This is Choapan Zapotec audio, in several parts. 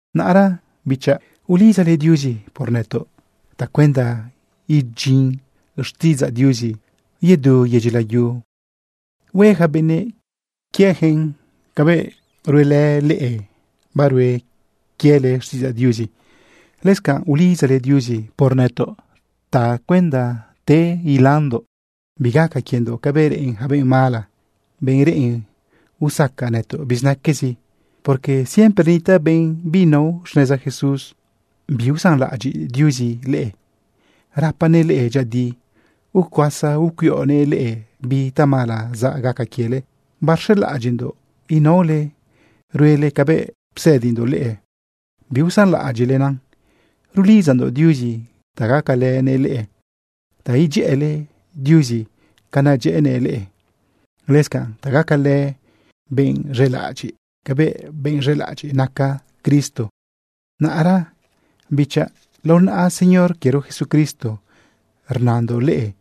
Naꞌra, bichaꞌ ulidzale Diuzi por nëtoꞌ tacuenda idyin xtiꞌidzaꞌ Diuzi yedu yedyi layu, hue yaca benëꞌ quieyaquen cabëꞌ ruele leꞌe, barue quiele xtiꞌidzaꞌ Diuzi. Lëscanꞌ ulidzale Diuzi por nëtoꞌ tacuenda te ilandoꞌ bigaca quiendoꞌ cabëꞌ reꞌen yaca benꞌ mala, benꞌ reꞌen usaca nëtoꞌ bizinaquezi, porque siempre nitaꞌ benꞌ binao xneza Jesús. Biusanlaꞌadyiꞌ Diuzi leꞌe. Rapanëꞌ leꞌe dyëꞌëdi. Ucuasa ucuiꞌonëꞌ leꞌe bi tamala zaꞌ gaca quiele leꞌe. Barz̃elaꞌadyiꞌndoꞌ inaole ruele cabëꞌ psëdindoꞌ leꞌe biusanlaꞌadyiꞌlena. Rulidzandoꞌ Diuzi ta gacalënëꞌ leꞌe ta idyëꞌële Diuzi ca nadyëꞌënëꞌ leꞌe, lëscanꞌ ta gacale benꞌ z̃elaꞌadyiꞌ cabëꞌ benꞌ z̃elaꞌadyiꞌ naca Cristo. Naꞌra, bichaꞌ, lao naꞌa Señor quiero Jesucristo, rnandoꞌ leꞌe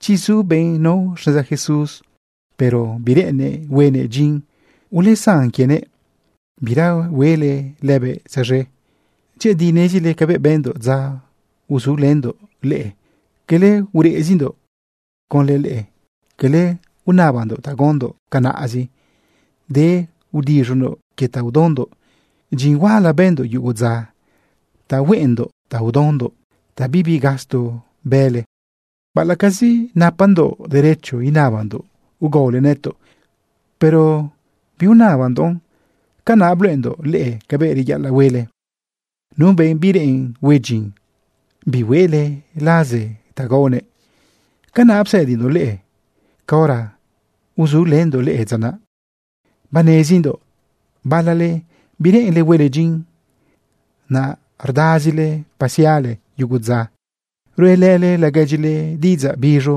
chi zu benꞌ nao xneza Jesús, pero bireꞌennëꞌ huenëꞌ dyin, ulesan quienëꞌ bira huele lëbëꞌ tzaz̃e. Dyëꞌëdi nezile cabëꞌ bëndoꞌ dza uzulëndoꞌ leꞌe. Cala ureꞌzindoꞌ conlë leꞌe, cala unabandoꞌ ta gaondoꞌ canaꞌzi, denꞌ udiz̃ondoꞌ quie ta udaondoꞌ. Dyin huala bëndoꞌ yugo dza ta hueꞌendoꞌ ta udaondoꞌ ta bibi gasto bële. Baꞌalaꞌcazi napandoꞌ derecho inabandoꞌ ugaole nëtoꞌ, pero biunabandoꞌn. Canaꞌ bluꞌendoꞌ leꞌe cabëꞌ reyaꞌalaꞌ huele. Nu benꞌ bireꞌen hue dyin, bihueꞌle laze ta gaonëꞌ. Canaꞌ psëdindoꞌ leꞌe caora uzulëndoꞌ leꞌe dza naꞌ. Banezindoꞌ balale bireꞌenle huele dyin, naꞌ rdazile pasiale yugo dza ruꞌelële laguedyile diꞌidzaꞌ biz̃u,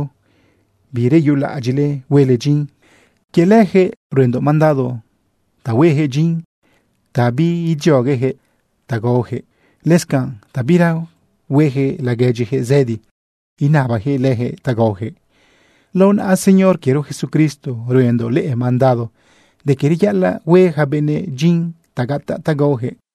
bireyulaꞌadyiꞌle huele dyin. Quie leyaquëꞌ ruendoꞌ mandado ta huejëꞌ dyin ta biidzioguejëꞌ ta gaojëꞌ, lëscanꞌ ta bira huejëꞌ laguedyijëꞌ zëdi inabajëꞌ lëjëꞌ ta gaojëꞌ. Lao naꞌa Señor quiero Jesucristo ruendoꞌ leꞌe mandado de que reyaꞌalaꞌ hue yaca benëꞌ dyin ta gataꞌ ta gaojëꞌ.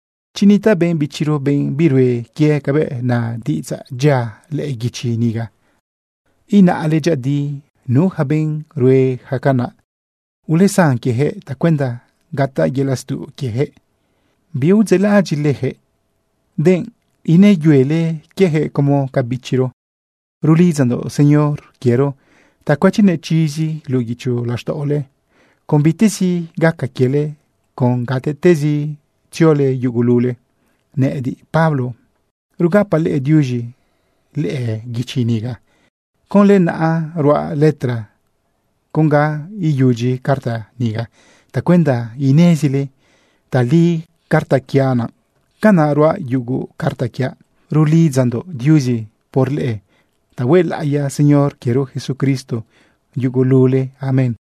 Chi nitaꞌ benꞌ bichiro, benꞌ birue quie cabëꞌ na diꞌidzaꞌ dyia lëꞌë guichi niga, inaꞌle dyëꞌëdi nu yaca benꞌ rue yaca canaꞌ. Ulesan quieyaquëꞌ tacuenda gataꞌ yelaꞌ stuꞌ quieyaquëꞌ. Biudzeꞌlaꞌadyiꞌle leyaquëꞌ, denꞌ inëyuele quiejëꞌ como ca bichiro. Rlidzandoꞌ Señor quiero ta cuëchinëꞌ chizi luꞌu guicho laxtaꞌole con bitezi gaca quiele con gatezi tziole yugulule. Nëꞌëdiꞌ, Pablo, rugapaꞌ leꞌe diuz̃i lëꞌë guichi niga. Conlë naꞌa ruaꞌ letra con ga iyudyi carta niga tacuenda inezile tali carta quiaꞌ naꞌ. Canaꞌ ruaꞌ yugo carta quiaꞌ. Rulidzandoꞌ Diuzi por leꞌe ta huelaꞌiya Señor quiero Jesucristo yugulule. Amén.